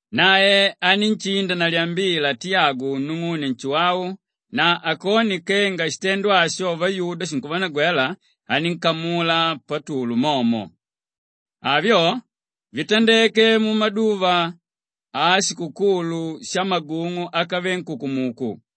Nae anínshinda na lyambila Tiyagu nung'une Nshuwau na akone kenga shitendo asho vayuda shinkuvanagwela, anínkamula Patulu momo. Avyo vitandeke mumaduva ashikukulu shamagung'u ákave nkukumuku.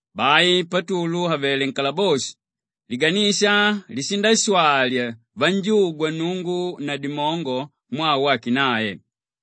Bai Patulu àvele nkalaboshi, liganisha lishindashwali vanjugwa Nnungu na dimongo mwaa wake nae.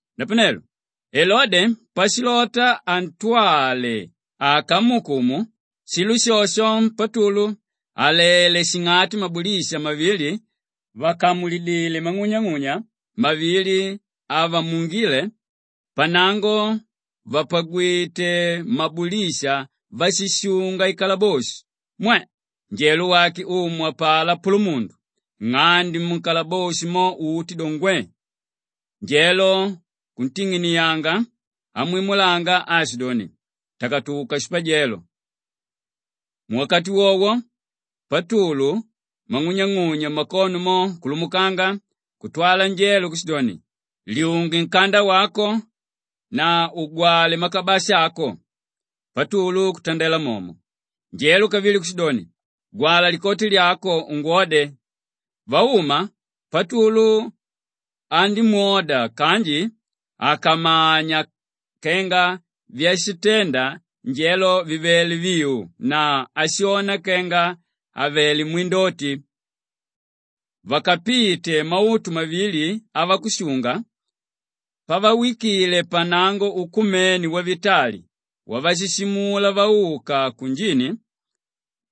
Napanelo Elode pashilota antwale akamuukumu, shilo shosho Patulu àlele shing'ati mabulisha mavili vàkamulidile mang'unyang'unya mavili avamuungile, pannango vàpagwite mabulisha váshishunga ikalaboshi, mwe! Njelo wake Umu apalá pulumundu, nng'ande nkalaboshi mo uti do, ngwe; njelo kunting'inianga amwimulanga aashidoni, “Takatuka shipajelo!” Muwakati wowo Patulu mang'unyang'unya mmakono mo kulumukanga kutwala njelo kushidoni, “Lyunge nkanda wako na ugwale makabasha ako!” Patulu kutandela momo. Njelo kavili kushidoni, “Gwala likoti lyako ungwode!” Vauma, Patulu andímwoda kanji àkamanya kenga vyashintenda njelo vivele viu; nae ashona kenga avelé mwindoti. Vakapite mautu mavili avakushunga, pavawikile pannango ukumene wavitali wavashuumila vauka kunjini,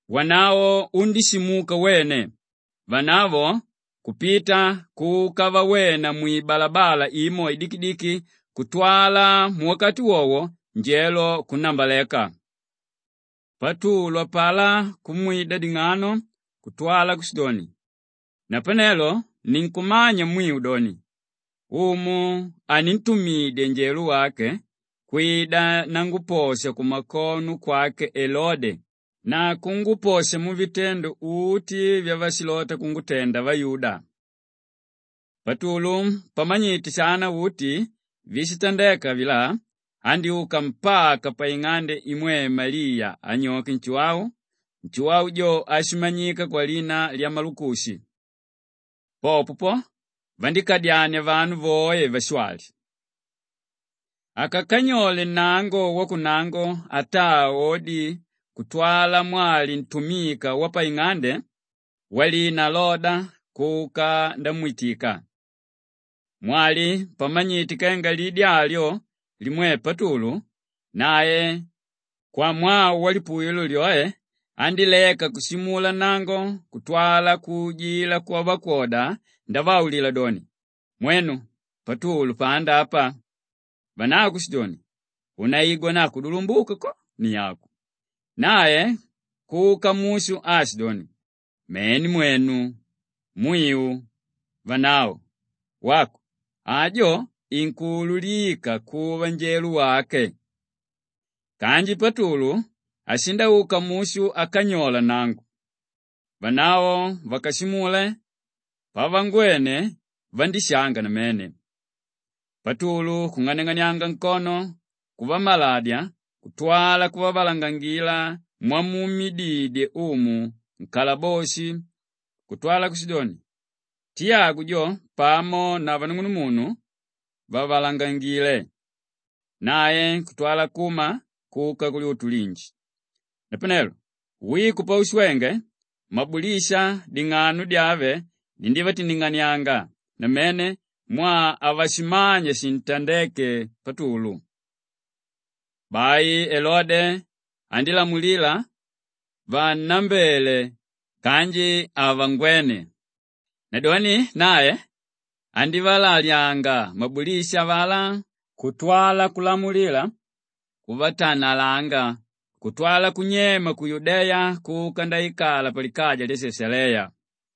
wanavo undíshimuka wene, vanavo kupita kuka vawena mwibalabala imo idikidiki kutwala muwakati wowo njelo kunnambaleka. Patulu apalá kumwida ding'ano kutwala kushidoni, “Napanelo ninkumanya mwiu doni, Umu anintumidya njelo wake kwida nanguposha kumakono kwake Elode na kunguposha muvitendo uti vyavashilota kungutenda vayuda.” Patulu pamanyite shana uti víshitandeka avilá andyúka mpaka paing'ande imwe Maliya anyoke Nshuwau, Nshuwau jo áshimanyika kwalina lya Malukushi. Popo po, vandíkadyania vanu voe vashwali. Akakanyola nnango wakunnango ataa odi kutwala mwali ntumika wapaing'ande walina Loda kuka ndamwitika. Mwali pamanyite kenga lidi alyo limwe Patulu, nae kwamwaa walipuwilo lyoe andíleka kushimula nnango kutwala kuujila kwavakwoda ndavaulila doni, “Mwenu Patulu panda apa!” Vanavo kushidoni, “Unaigwa na kudulumbuka ko ni aku!” Nae kuka mushu aashidoni, “Mene mwenu, mwiu!” Vanavo, “Wako, ajo inkuululika kuva njelo wake.” Kanji Patulu ashindauka mushu akanyola nnango. Vanavo vakashimule, pavangwene vandíshanga namene. Patulu kung'aniang'anianga nkono kuvamaladya kutwala kuvavalangangila mwamuumididye Umu nkalaboshi kutwala kushidoni, “Tiyagu jo pamo na vanung'unumunu, vavalangangile.” Nae kutwala kuma kuka kulyutu linji. Napanelo wiko paushwenge, mabulisha ding'ano dyave dindívatindinganianga namene mwaa havashimanya shintandéke Patulu. Bai Elode andílamulila vannambele kanji havangwene. Nadoni nae andívalalyanga mabulisha avalá kutwala kulamulila kuvatanalanga kutwala kunyema ku Yudeya kuka ndaikala palikaja lya Shashaleya.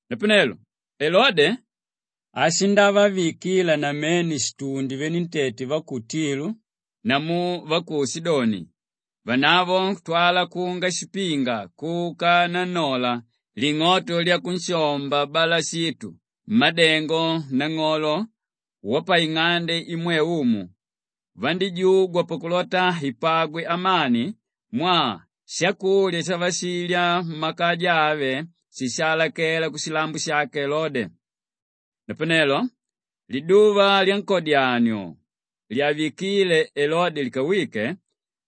Napanelo Elode, ashindavavikila namene shitundi venentete va ku Tilu namu va ku Shidoni, vanavo kutwala kunga shipinga kuka nannola ling'oto lyakunshomba Balashitu, mmádengo nang'olo wapaing'ande imwe umu, vandíjugwa pakulota ipagwe amani mwaa shakulya shavashilya mmakaja ave shishaalakela kushilambo shake Elode. Napanelo liduva lyankodyanio lyavikíle Elode likawike,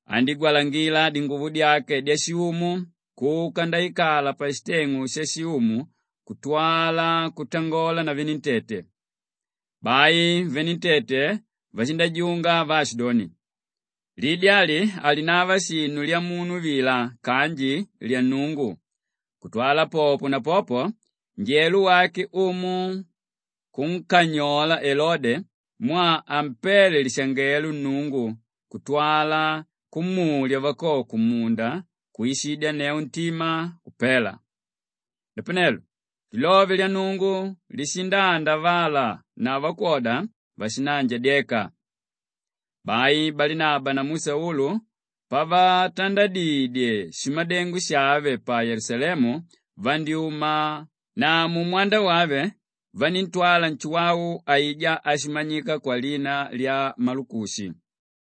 andígwalangila dinguvo dyake dyashiumu kuka ndaikala pashiteng'u shashiumu kutwala kutangola na venentete. Bai venentete vashindajunga vaashidoni, “Lidi ali halinava shinu lyamunu vila kanji lyannungu.” Kutwala popo na popo, njelo wake Umu kunkanyola Elode mwaa hampéle lishangelo Nnungu kutwala kumulya vakoko mmunda kwishidyanneu ntima, kupela. Napanelo lilove lya Nnungu lishindaandavala na vakwoda vashindaanjadyeka. Bai Balinaba namu Saulu pavatandadidye shimadengo shave pa Yelusalemu vandyúma na mumwanda wave vaníntwala Nshuwau aijá áshimanyika kwalina lya Malukushi.